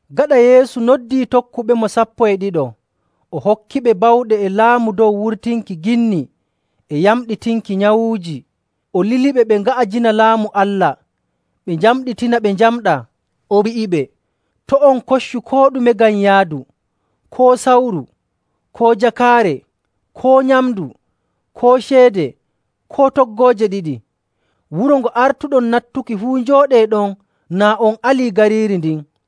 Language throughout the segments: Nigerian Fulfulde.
Gaɗa Yeesu noddii tokkuɓemo sappo e ɗiɗo, o hokkiɓe bawɗe e laamu dow wurtinki ginni e yamɗinki nyawuuji. O liliɓe ɓe nga'ajina Laamu Allah, ɓe njamɗitina ɓe njamɗaa. O wi'iɓe, “To' on koccu koo ɗume ngam yaadu, koo sawru, koo jakaare, koo nyamndu, koo ceede, koo toggooje ɗiɗi. Wuro ngo artuɗon nattuki fuu, njooɗee ɗon naa on alii gariiri ndin.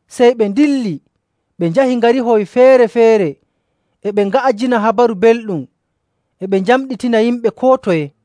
Sey ɓe ndilli, ɓe njahi ngarihoy feere‑feere, e ɓe nga'ajina Habaru Belɗum, e ɓe njamɗitina yimɓe koo toye.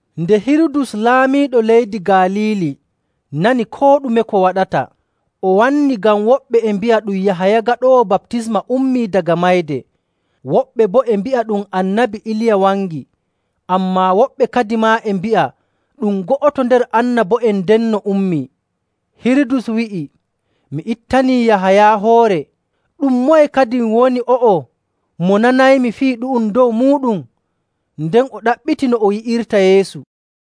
Nde Hirudus, laamiiɗo leydi Galiili, nani koo ɗume ko waɗata, o wannii ngam woɓɓe e mbi'a ɗum Yahaya Gaɗoowo Baptisma ummii daga mayde. Woɓɓe boo e mbi'a ɗum Annabi Iliya wangi, ammaa woɓɓe kadimaa e mbi'a ɗum go'oto nder annabo'en ndenno ummii.. Hirudus wi'i, “Mi ittanii Yahaya hoore. Ɗum moye kadin woni o'o, mo nanaymi fii ɗu'um dow muuɗum?” Nden o ɗaɓɓiti no o yi'irta Yeesu.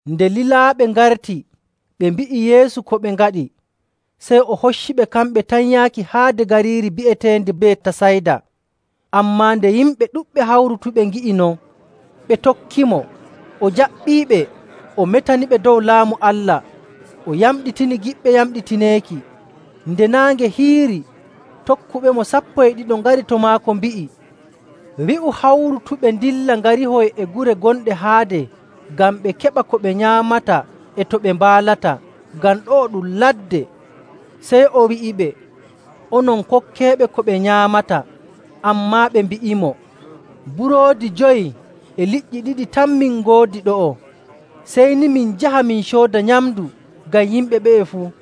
Nde lilaaɓe ngarti, ɓe mbi'i Yeesu ko ɓe ngaɗi. Sey o hocciɓe kamɓe tan yaaki haade gariiri bi'eteendi Betasayda. Ammaa nde yimɓe ɗuɗɓe hawrutuɓe ngi'i non, ɓe tokkimo. O jaɓɓiiɓe, o metaniɓe dow Laamu Allah. O yamɗitini giɗɓe yamɗitineeki. Nde naange hiiri, tokkuɓemo sappo e ɗiɗo ngari to maako, mbi'i, “Wi'u hawrutuɓe ndilla ngarihoy e gure gonɗe haade ngam ɓe keɓa ko ɓe nyaamata e to ɓe mbaalata, ngam ɗo'o ɗum ladde.” Sey o wi'iɓe, “Onon kokkeeɓe ko ɓe nyaamata.” Ammaa ɓe mbi'imo, “Buroodi jowi e liƴƴi ɗiɗi tan min ngoodi ɗo'o. Sey ni min njaha, min cooda nyamndu ngam yimɓe ɓe'e fuu.”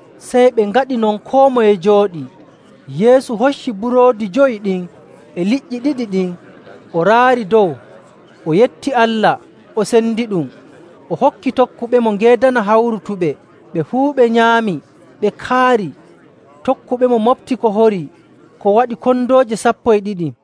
Sey ɓe ngaɗi non, koo moye jooɗii. Yeesu hocci buroodi jowi ɗin e liƴƴi ɗiɗi ɗin, o raari dow, o yetti Allah, o sendiɗum, o hokki tokkuɓemo ngeedana hawrutuɓe. Ɓe fuu ɓe nyaami, ɓe kaari. Tokkuɓemo moɓti ko horii ko waɗi kondooje sappo e ɗiɗi.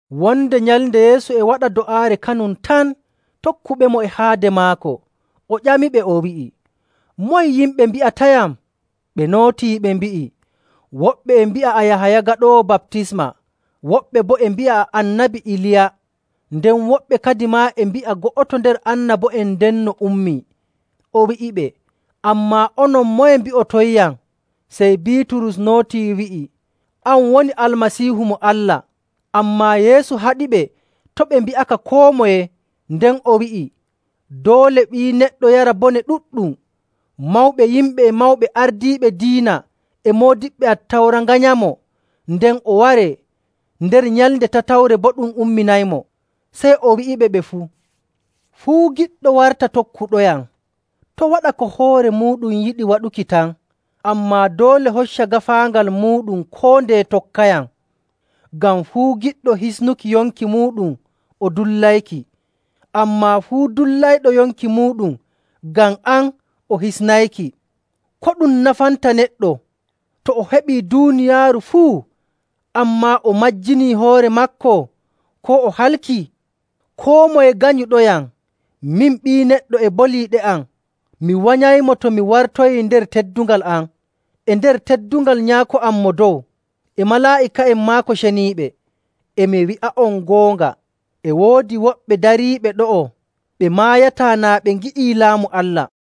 Wonde nyalnde Yeesu e waɗa do'aare, kanum tan, tokkuɓemo e haade maako. O ƴamiɓe, o wi'i, “Moye yimɓe mbi'atayam?” Ɓe nootii ɓe mbi'i, “Woɓɓe e mbi'a a Yahaya Gaɗoowo Baptisma. Woɓɓe boo e mbi'a a Annabi Iliya. Nden woɓɓe kadimaa e mbi'a go'oto nder annabo'en ndenno ummii.”. O wi'iɓe, “Ammaa onon, moye mbi'otonyam?” Sey Biiturus nootii, wi'i, “An woni Almasiihu mo Allah!”. Ammaa Yeesu haɗiɓe to' ɓe mbi'aka koo moye. Nden o wi'i, “Doole Ɓii Neɗɗo yara bone ɗuɗɗum. Mawɓe yimɓe e mawɓe ardiiɓe diina e moodiɓɓe Attawra nganyamo, nden o waree. Nder nyalnde tatawre boo ɗum umminaymo.” Sey o wi'iɓe ɓe fuu, “Fuu giɗɗo warta tokkuɗoyam, to' waɗa ko hoore muuɗum yiɗi waɗuki tan, ammaa doole hocca gaafaangal muuɗum koo ndeye tokkayam.. Ngam fuu giɗɗo hisnuki yonki muuɗum o dullayki. Ammaa fuu dullayɗo yonki muuɗum ngam am o hisnayki.. Ko ɗum nafanta neɗɗo, to o heɓii duuniyaaru fuu, ammaa o majjinii hoore maako koo o halki? Koo moye ganyuɗoyam, min Ɓii Neɗɗo e boliiɗe am, mi wanyaymo to mi wartoyii nder teddungal am, e nder teddungal Nyaako am Mo Dow, e malaa'ika'en maako ceniiɓe. E mi wi'a'on goonga, e woodi woɓɓe dariiɓe ɗo'o ɓe maayataa naa ɓe ngi'ii Laamu Allah.”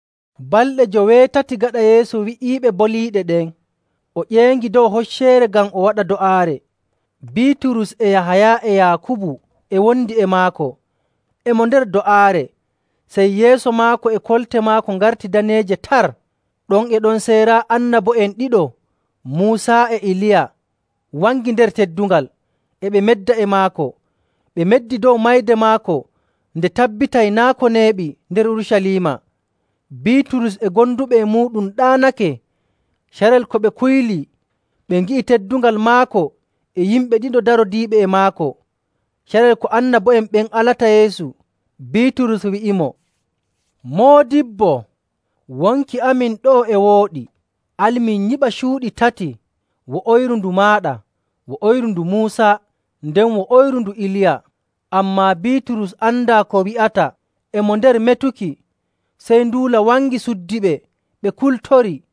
Balɗe joweetati gaɗa Yeesu wi'iɓe boliiɗe ɗen, o ƴeeŋi dow hocceere ngam o waɗa do'aare. Biiturus, e Yahaya, e Yaakubu e wondi e maako. E mo nder do'aare sey yeeso maako e kolte maako ngarti daneeje tar. Ɗon e ɗon sey raa, annabo'en ɗiɗo, Muusa e Iliya, wangi nder teddungal, e ɓe medda e maako. Ɓe meddi dow mayde maako nde tabbitay naa' ko neeɓi nder Urucaliima. Biiturus e gonduɓe e muuɗum ɗaanake, carel ko ɓe kuylii, ɓe ngi'i teddungal maako e yimɓe ɗiɗo darodiiɓe e maako. Carel ko annabo'en ɓen alata Yeesu, Biiturus wi'imo, “Moodibbo, wonki amin ɗo'o e wooɗi. Al min nyiɓa cuuɗi tati, wo'oyru ndu maaɗa, wo'oyru ndu Muusa, nden wo'oyru ndu Iliya.” Ammaa Biiturus andaa ko wi'ata. E mo nder metuki, sey nduula wangi, suddiɓe, ɓe kultori.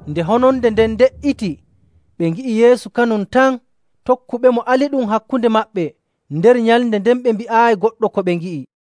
Nde hononde nden de''iti, ɓe ngi'i Yeesu kanum tan. Tokkuɓemo aliɗum hakkunde maɓɓe, nder nyalɗe ɗen ɓe mbi'aayi goɗɗo ko ɓe ngi'i.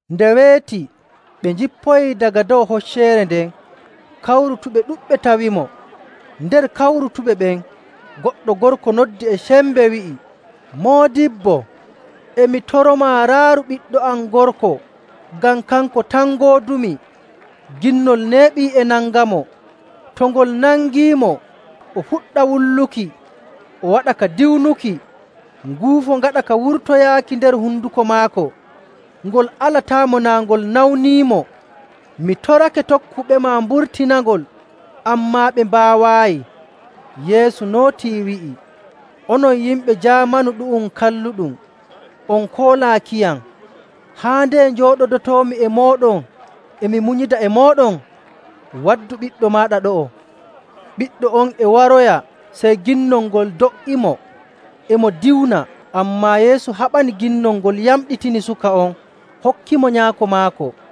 Nde weeti, ɓe njippoyii daga dow hocceere nden, kawrutuɓe ɗuɗɓe tawimo. Nder kawrutuɓe ɓen goɗɗo gorko noddi e sembe, wi'i, “Moodibbo, e mi toromaa, raaru ɓiɗɗo am gorko ngam kanko tan ngoodumi. Ginnol neeɓii e nangamo. To ngol nangiimo, o fuɗɗa wulluki, o waɗa ka diwnuki, nguufo ngaɗa ka wurtoyaaki nder honduko maako, ngol alataamo naa ngol nawniimo. Mi torake tokkuɓema mburtinangol, ammaa ɓe mbaawaayi.” Yeesu nootii, wi'i, “Onon yimɓe jaamanu ɗu'um kalluɗum on koolaakiyam, haa ndeye njooɗodotoomi e mooɗon e mi munyida e mooɗon? Waddu ɓiɗɗo maaɗa ɗo'o.” Ɓiɗɗo on e waroya, sey ginnol ngol do''imo, e mo diwna. Ammaa Yeesu haɓani ginnol ngol, yamɗitini suka on, hokkitimo nyaako maako.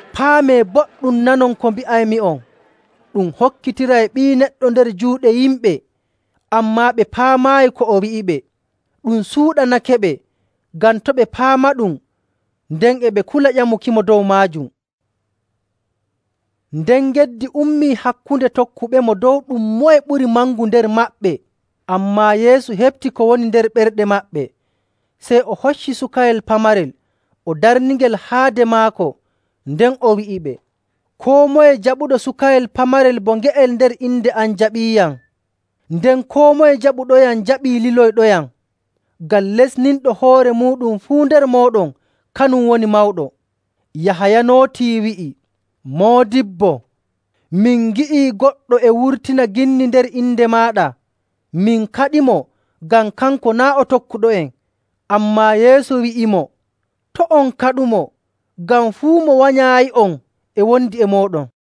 “Paamee boɗɗum nanon ko mbi'aymi'on! Ɗum hokkitiray Ɓii Neɗɗo nder juuɗe yimɓe.” Ammaa ɓe paamaayi ko o wi'iɓe. Ɗum suuɗanakeɓe ngam to' ɓe paamaɗum, nden e ɓe kula ƴamukimo dow maajum. Moye Ɓuri Mangu? Nden geddi ummii hakkunde tokkuɓemo dow ɗum moye ɓuri mangu nder maɓɓe.. Ammaa Yeesu heɓti ko woni nder ɓerɗe maɓɓe, sey o hocci sukayel pamarel, o darningel haade maako. Nden o wi'iɓe, “Koo moye jaɓuɗo sukayel pamarel bo nge'el nder inde am jaɓiiyam. Nden koo moye jaɓuɗoyam jaɓii liloyɗoyam. Ngam lestinɗo hoore muuɗum fuu nder mooɗon, kanum woni mawɗo.”. Yahaya nootii, wi'i, “Moodibbo, min ngi'ii goɗɗo e wurtina ginni nder inde maaɗa, min kaɗimo ngam kanko naa' o tokkuɗo'en.” Ammaa Yeesu wi'imo, “To' on kaɗumo, ngam fuu mo wanyaayi'on e wondi e mooɗon.”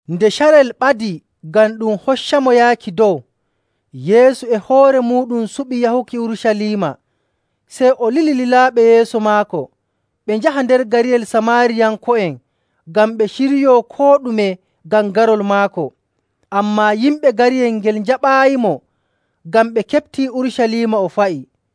Nde carel ɓadii ngam ɗum hoccamo yaaki dow, Yeesu e hoore muuɗum suɓi yahuki Urucaliima. Sey o lili lilaaɓe yeeso maako, ɓe njaha nder gariyel Samaariyanko'en ngam ɓe ciryoo koo ɗume ngam garol maako. Ammaa yimɓe gariyel ngel njaɓaayimo ngam ɓe keɓtii Urucaliima o fa'i.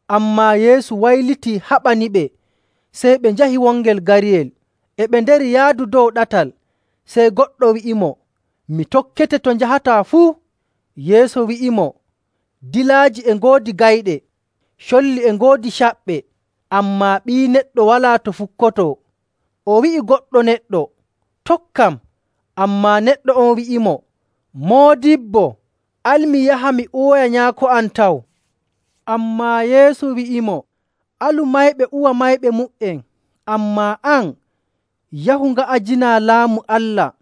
Ammaa Yeesu waylitii haɓaniɓe, sey ɓe njahi wongel gariyel. E ɓe nder yaadu dow ɗatal, sey goɗɗo wi'imo, “Mi tokkete to njahataa fuu.” Yeesu wi'imo, “Dilaaji e ngoodi gayɗe, colli e ngoodi caɓɓe, ammaa Ɓii Neɗɗo walaa to fukkotoo.” O wi'i goɗɗo neɗɗo, “Tokkam.” Ammaa neɗɗo on wi'imo, “Moodibbo, al mi yaha, mi uwoya nyaako am taw.” Ammaa Yeesu wi'imo, “Alu mayɓe uwa mayɓe mu''en, ammaa an, yahu, nga'ajinaa Laamu Allah.”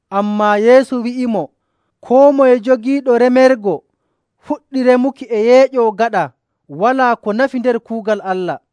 Ammaa Yeesu wi'imo, “Koo moye jogiiɗo remergo fuɗɗi remuki e yeeƴoo gaɗa, walaa ko nafi nder kuugal Allah.”